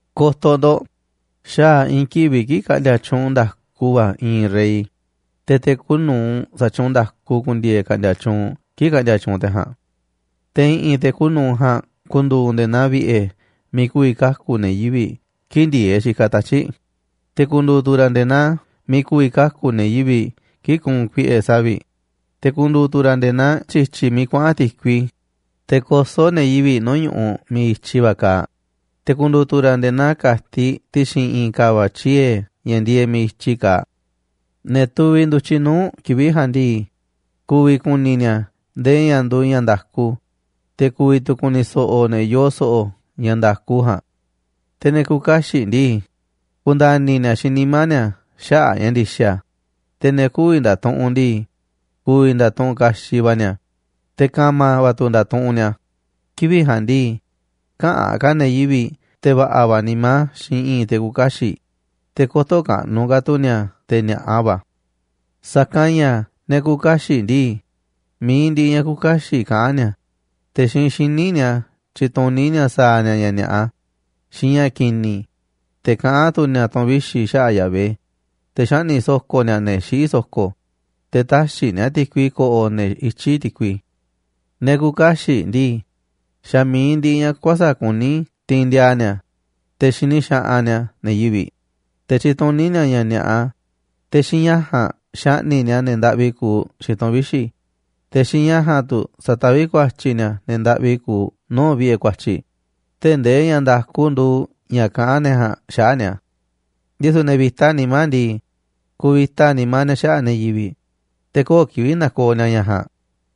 Ko̱to̱ ndo̱ꞌ, xaa̱ i̱i̱n kivi̱ꞌ kii̱ꞌ ka̱ꞌndi̱a̱ tyuunꞌ nda̱ku va̱ i̱i̱n rey, te̱ te̱ kuuꞌ nu̱uꞌ sa̱tyuunꞌ nda̱ku ku̱ndi̱e̱e̱ ka̱ꞌndi̱a̱ tyuunꞌ kii̱ꞌ ka̱ꞌndi̱a̱ tyuunꞌ te̱ ja̱a̱nꞌ. Te̱ i̱ꞌi̱n te̱ kuuꞌ nu̱uꞌ ja̱a̱nꞌ ku̱ndu̱u̱ nde̱e̱ naa vi̱ꞌe̱ miiꞌ ku̱vi̱ kaku̱ ne̱ yivi̱ꞌ kii̱ꞌ ndi̱e̱eꞌ xikaꞌ tatyi̱ꞌ. Te̱ ku̱ndu̱u̱ tu̱ ra̱ nde̱e̱ naa miiꞌ ku̱vi̱ kaku̱ ne̱ yivi̱ꞌ kii̱ꞌ ku̱u̱n kuiꞌe̱ savi̱ꞌ, te̱ ku̱ndu̱u̱ tu̱ ra̱ nde̱e̱ naa tyi̱tyi̱ miiꞌ kuaꞌa̱n ti̱kui, te̱ kosó ne̱ yivi̱ꞌ nuu̱ꞌ ñu̱ꞌuꞌ miiꞌ i̱tyi va̱ kaaꞌ, te̱ ku̱ndu̱u̱ tu̱ ra̱ nde̱e̱ naa ka̱tiꞌ ti̱xi̱n i̱i̱n ka̱va̱ꞌ tyiee̱ ña̱ ndieeꞌ miiꞌ i̱tyi kaaꞌ. Ne̱ tuviꞌ ndu̱tyiꞌ nuu̱ꞌ kivi̱ꞌ ja̱a̱nꞌ ndii, ku̱vi̱ ku̱ni̱ ni̱a̱ ndee ña̱ nduuꞌ ña̱ nda̱ku, te̱ ku̱vi̱ tu̱ ku̱ni̱ so̱ꞌo̱ ne̱ yoo so̱ꞌo̱ ña̱ nda̱ku ja̱a̱nꞌ. Te̱ ne̱ küuꞌ kaxiꞌ ndii, ku̱nda̱ni̱ ni̱a̱ xiinꞌ nimá ni̱a̱ xaꞌa̱ꞌ ña̱ ndi̱xa̱, te̱ ne̱ kü̱vi̱ nda̱tuꞌunꞌ ndii, ku̱vi̱ nda̱tuꞌunꞌ kaxiꞌ va̱ ni̱a̱, te̱ ka̱ma̱ va̱ tu̱ nda̱tuꞌunꞌ ni̱a̱. Kivi̱ꞌ ja̱a̱nꞌ ndii, käꞌa̱n ka̱ ne̱ yivi̱ꞌ te̱ va̱ꞌa̱ va̱ nimá xiinꞌ i̱i̱n te̱ küuꞌ kaxiꞌ, te̱ kö̱to̱ kaꞌnuꞌ ka̱ tu̱ ni̱a̱ te̱ ni̱a̱ꞌa va̱. Sa̱kanꞌ ña̱ ne̱ küuꞌ kaxiꞌ ndii, mi̱iꞌ ndiꞌiꞌ ña̱ küuꞌ kaxiꞌ kaꞌán ni̱a̱, te̱ xiinꞌ xíniꞌ ni̱a̱ tyituní ni̱a̱ sa̱a̱ ni̱a̱ ña̱ ni̱a̱ꞌa xiinꞌ ña̱ ki̱ni̱, te̱ kaꞌán tu̱ ni̱a̱ tu̱n vixi̱ xaꞌa̱ꞌ Yahvé, te̱ xaꞌni̱ꞌ so̱ko̱ ni̱a̱ ne̱ xiꞌí so̱ko̱, te̱ täxiꞌ ni̱a̱ ti̱kui ko̱ꞌo̱ ne̱ ityí ti̱kui. Ne̱ küuꞌ kaxiꞌ ndii, xa̱ mi̱iꞌ ndiꞌiꞌ ña̱ kuäsa̱ꞌ kuní tiinꞌ ndiaa ni̱a̱, te̱ xini xaꞌanꞌ ni̱a̱ ne̱ yivi̱ꞌ, te̱ tyituní ni̱a̱ ña̱ ni̱a̱ꞌa, te̱ xiinꞌ ña̱ ja̱a̱nꞌ xaꞌni̱ꞌ ni̱a̱ ne̱ ndaꞌvi kuuꞌ xiinꞌ tu̱n vixi̱, te̱ xiinꞌ ña̱ ja̱a̱nꞌ tu̱ sataví ku̱a̱tyi̱ ni̱a̱ ne̱ ndaꞌvi kuuꞌ nuu̱ꞌ vi̱ꞌe̱ ku̱a̱tyi̱, tee̱ꞌ ndee ña̱ nda̱ku nduuꞌ ña̱ kaꞌán ne̱ ja̱a̱nꞌ xaꞌa̱ꞌ ni̱a̱. Ndisu̱ ne̱ vi̱ta nimá ndii, kuvita nimá ni̱a̱ xaꞌa̱ꞌ ne̱ yivi̱ꞌ, te̱ köo̱ꞌ kivi̱ꞌ nakooꞌ ni̱a̱ ña̱ ja̱a̱nꞌ.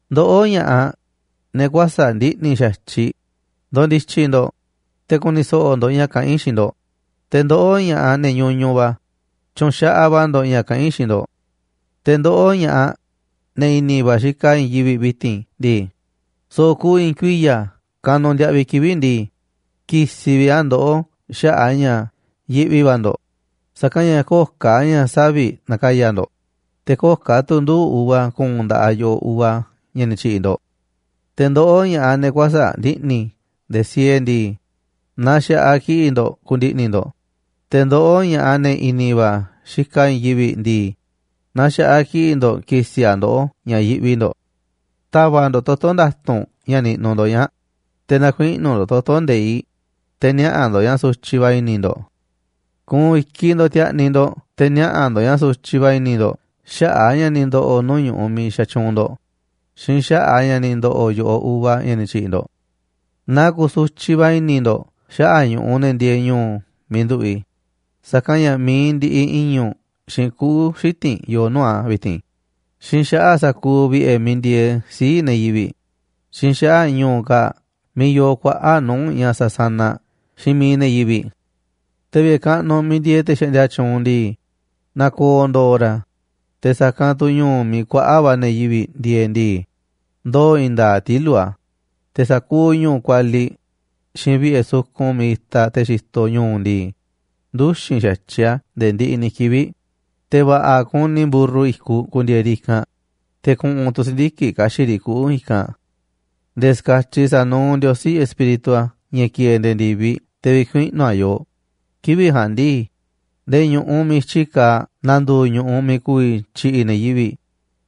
Ndoꞌó, ña̱ꞌaꞌ, ne̱ kuäsa̱ꞌ ndiꞌni̱ xa̱tyiꞌ, ndo̱ndi̱tyi̱ ndo̱ꞌ, te̱ ku̱ni̱ so̱ꞌo̱ ndo̱ꞌ ña̱ kaꞌán i̱ xiinꞌ ndo̱ꞌ, te̱ ndoꞌó ña̱ꞌaꞌ, ne̱ ñuñuꞌ va̱, tyu̱nxaꞌaꞌ va̱ ndo̱ꞌ ña̱ kaꞌán i̱ xiinꞌ ndo̱ꞌ. Te̱ ndoꞌó, ña̱ꞌaꞌ ne̱ i̱ni̱ va̱ xikaꞌ i̱i̱n yivi̱ꞌ vi̱ti̱n ndii, so̱ꞌo̱ kuuꞌ i̱i̱n kuiya̱ kanuꞌ ndiaꞌviꞌ kivi̱ꞌ ndii, ki̱si̱ vi̱ꞌ a̱ ndoꞌó xaꞌa̱ꞌ a̱ ña̱ yiꞌvi va̱ ndo̱ꞌ, sa̱kanꞌ ña̱ köo̱ꞌ ka̱ ña̱ saviꞌ na̱ka̱ya̱ ndo̱ꞌ, te̱ köo̱ꞌ ka̱ tu̱ nduu̱ꞌ uva ku̱u̱n nda̱ꞌaꞌ yo̱ꞌoꞌ uva ña̱ ni̱ tyi̱ꞌi̱ ndo̱ꞌ. Te̱ ndoꞌó, ña̱ꞌaꞌ, ne̱ kuäsa̱ꞌ ndiꞌni̱ ndee siee ndii, na xa̱ꞌaꞌ kiꞌi̱ꞌ ndo̱ꞌ ku̱ndi̱ꞌni̱ ndo̱ꞌ, te̱ ndoꞌó, ña̱ꞌaꞌ, ne̱ i̱ni̱ va̱ xikaꞌ i̱i̱n yivi̱ꞌ ndii, na xa̱ꞌaꞌ kiꞌi̱ꞌ ndo̱ꞌ ki̱si̱ a̱ ndoꞌó ña̱ yiꞌvi ndo̱ꞌ. Ta̱va̱ꞌ ndo̱ꞌ toto̱ nda̱tu̱nꞌ ña̱ niꞌnuꞌ ndo̱ꞌ ñaa̱ꞌ, te̱ na̱kuiꞌnu̱ ndo̱ꞌ toto̱ nde̱iꞌ, te̱ niaꞌa̱ ndo̱ꞌ ña̱ sutyiꞌ va̱ i̱ni̱ ndo̱ꞌ. Ku̱u̱n i̱kiꞌ ndo̱ꞌ ti̱a̱ꞌni̱ ndo̱ꞌ te̱ niaꞌa̱ ndo̱ꞌ ña̱ sutyiꞌ va̱ i̱ni̱ ndo̱ꞌ xaꞌa̱ꞌ a̱ ña̱ ni̱ ndo̱ꞌo̱ nuu̱ꞌ ñu̱ꞌuꞌ miiꞌ xatyuunꞌ ndo̱ꞌ xiinꞌ xaꞌa̱ꞌ ña̱ ni̱ ndo̱ꞌo̱ yo̱ꞌoꞌ uva ña̱ ni̱ tyi̱ꞌi̱ ndo̱ꞌ. Na ku̱su̱tyiꞌ va̱ i̱ni̱ ndo̱ꞌ xaꞌa̱ꞌ ñu̱ꞌuꞌ ne̱ ndieeꞌ ñu̱u̱ miiꞌ nduꞌu̱ꞌ i̱, sa̱kanꞌ ña̱ mi̱iꞌ ndiꞌiꞌ i̱ñu̱ꞌ xiinꞌ kuꞌu̱ xiti̱nꞌ yoo nuu̱ꞌ a̱ vi̱ti̱n, xiinꞌ xaꞌa̱ꞌ sa̱kuuꞌ vi̱ꞌe̱ miiꞌ ndieeꞌ sii̱ꞌ ne̱ yivi̱ꞌ, xiinꞌ xaꞌa̱ꞌ ñu̱u̱ kaa̱ꞌ miiꞌ yoo kuaꞌa̱ꞌ nuu̱ꞌ ña̱ sásánaꞌ xiinꞌ miiꞌ ne̱ yivi̱ꞌ. Te̱ vi̱ꞌe̱ kaꞌnuꞌ miiꞌ ndieeꞌ te̱ xaꞌndia tyuunꞌ ndii, na̱ko̱o̱ ndo̱o̱ ra̱, te̱ sa̱kanꞌ tu̱ ñu̱u̱ miiꞌ kuaꞌa̱ꞌ va̱ ne̱ yivi̱ꞌ ndieeꞌ ndii, ndoo̱ i̱i̱n nda̱a̱ꞌ tilu̱ꞌ a̱. Te̱ sa̱kuuꞌ ñu̱u̱ kualiꞌ xiinꞌ vi̱ꞌe̱ sukun miiꞌ itaꞌ te̱ xitoꞌ ñu̱u̱ ndii, nduxi̱n xa̱tyiꞌ a̱ nde̱e̱ ndiꞌiꞌ ni̱ kivi̱ꞌ, te̱ va̱ꞌa̱ kuni mburru i̱kuꞌ ku̱ndi̱e̱e̱ riꞌ i̱kanꞌ, te̱ ku̱ꞌu̱n tu̱ si̱ndiki̱ꞌ ka̱xi̱ꞌ riꞌ kuꞌu̱ i̱kanꞌ. Nde̱e̱ ska̱tyiꞌ sa̱nuuꞌ Ndiosí Espíritu a̱, ña̱ ki̱e̱e̱ nde̱e̱ ndi̱viꞌ, te̱ vi̱kuiꞌnu̱ a̱ yooꞌ. Kivi̱ꞌ ja̱a̱nꞌ ndii, nde̱e̱ ñu̱ꞌuꞌ miiꞌ i̱tyi kaaꞌ na̱ndu̱u̱ ñu̱ꞌuꞌ miiꞌ ku̱vi̱ tyi̱ꞌi̱ ne̱ yivi̱ꞌ,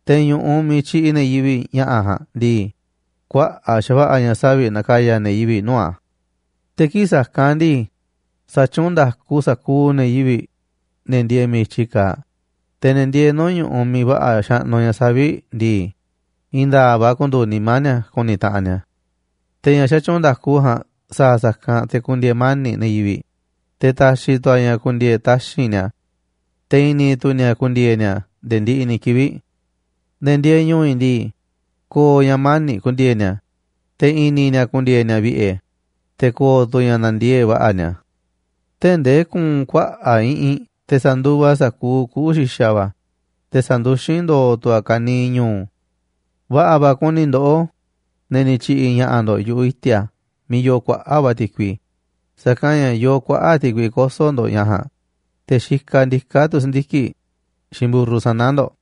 te̱ ñu̱ꞌuꞌ miiꞌ tyi̱ꞌi̱ ne̱ yivi̱ꞌ ña̱ꞌa̱ ja̱a̱nꞌ ndii, kuaꞌa̱ꞌ xa̱va̱ꞌa̱ ña̱ savi̱ꞌ na̱ka̱ya̱ ne̱ yivi̱ꞌ nuu̱ꞌ a̱. Te̱ kii̱ꞌ sa̱kanꞌ ndii, sa̱tyuunꞌ nda̱ku sa̱kuuꞌ ne̱ yivi̱ꞌ, ne̱ ndieeꞌ miiꞌ i̱tyi kaaꞌ, te̱ ne̱ ndieeꞌ nuu̱ꞌ ñu̱ꞌuꞌ miiꞌ va̱ꞌa̱ xaꞌnuꞌ ña̱ saviꞌ ndii, i̱i̱n nda̱a̱ꞌ va̱ ku̱ndu̱u̱ nimá ni̱a̱ ku̱ni̱ taꞌanꞌ ni̱a̱. Te̱ ña̱ xatyuunꞌ nda̱ku ja̱a̱nꞌ sa̱a̱ sa̱kanꞌ te̱ ku̱ndi̱e̱e̱ mani̱ꞌ ne̱ yivi̱ꞌ, te̱ ta̱xi̱ tu̱ a̱ ña̱ ku̱ndi̱e̱e̱ taxi̱nꞌ ni̱a̱, te̱ i̱ni̱ tu̱ ni̱a̱ ku̱ndi̱e̱e̱ ni̱a̱ nde̱e̱ ndiꞌiꞌ ni̱ kivi̱ꞌ. Ne̱ ndieeꞌ ñu̱u̱ i̱ ndii, ko̱o̱ ña̱ mani̱ꞌ ku̱ndi̱e̱e̱ ni̱a̱, te̱ i̱ni̱ ni̱a̱ ku̱ndi̱e̱e̱ ni̱a̱ vi̱ꞌe̱, te̱ ko̱o̱ tu̱ ña̱ na̱ndiee̱ꞌ va̱ꞌa̱ ni̱a̱, tee̱ꞌ ndee ku̱u̱n kuaꞌa̱ꞌ iꞌinꞌ te̱ sa̱nduvaꞌ a̱ sa̱kuuꞌ kuꞌu̱ xi̱xa̱ va̱, te̱ sa̱nduxín ndo̱o̱ tu̱ a̱ kaniiꞌ ñu̱u̱. Va̱ꞌa̱ va̱ kuni ndoꞌó, ne̱ ni̱ tyi̱ꞌi̱ ña̱ꞌa̱ ndo̱ꞌ yu̱ꞌuꞌ i̱ti̱a̱ miiꞌ yoo kuaꞌa̱ꞌ va̱ ti̱kui, sa̱kanꞌ ña̱ yoo kuaꞌa̱ꞌ ti̱kui koso̱ ndo̱ꞌ ña̱ ja̱a̱nꞌ, te̱ xikaꞌ ndiká tu̱ si̱ndiki̱ꞌ xiinꞌ mburru sana̱ ndo̱ꞌ.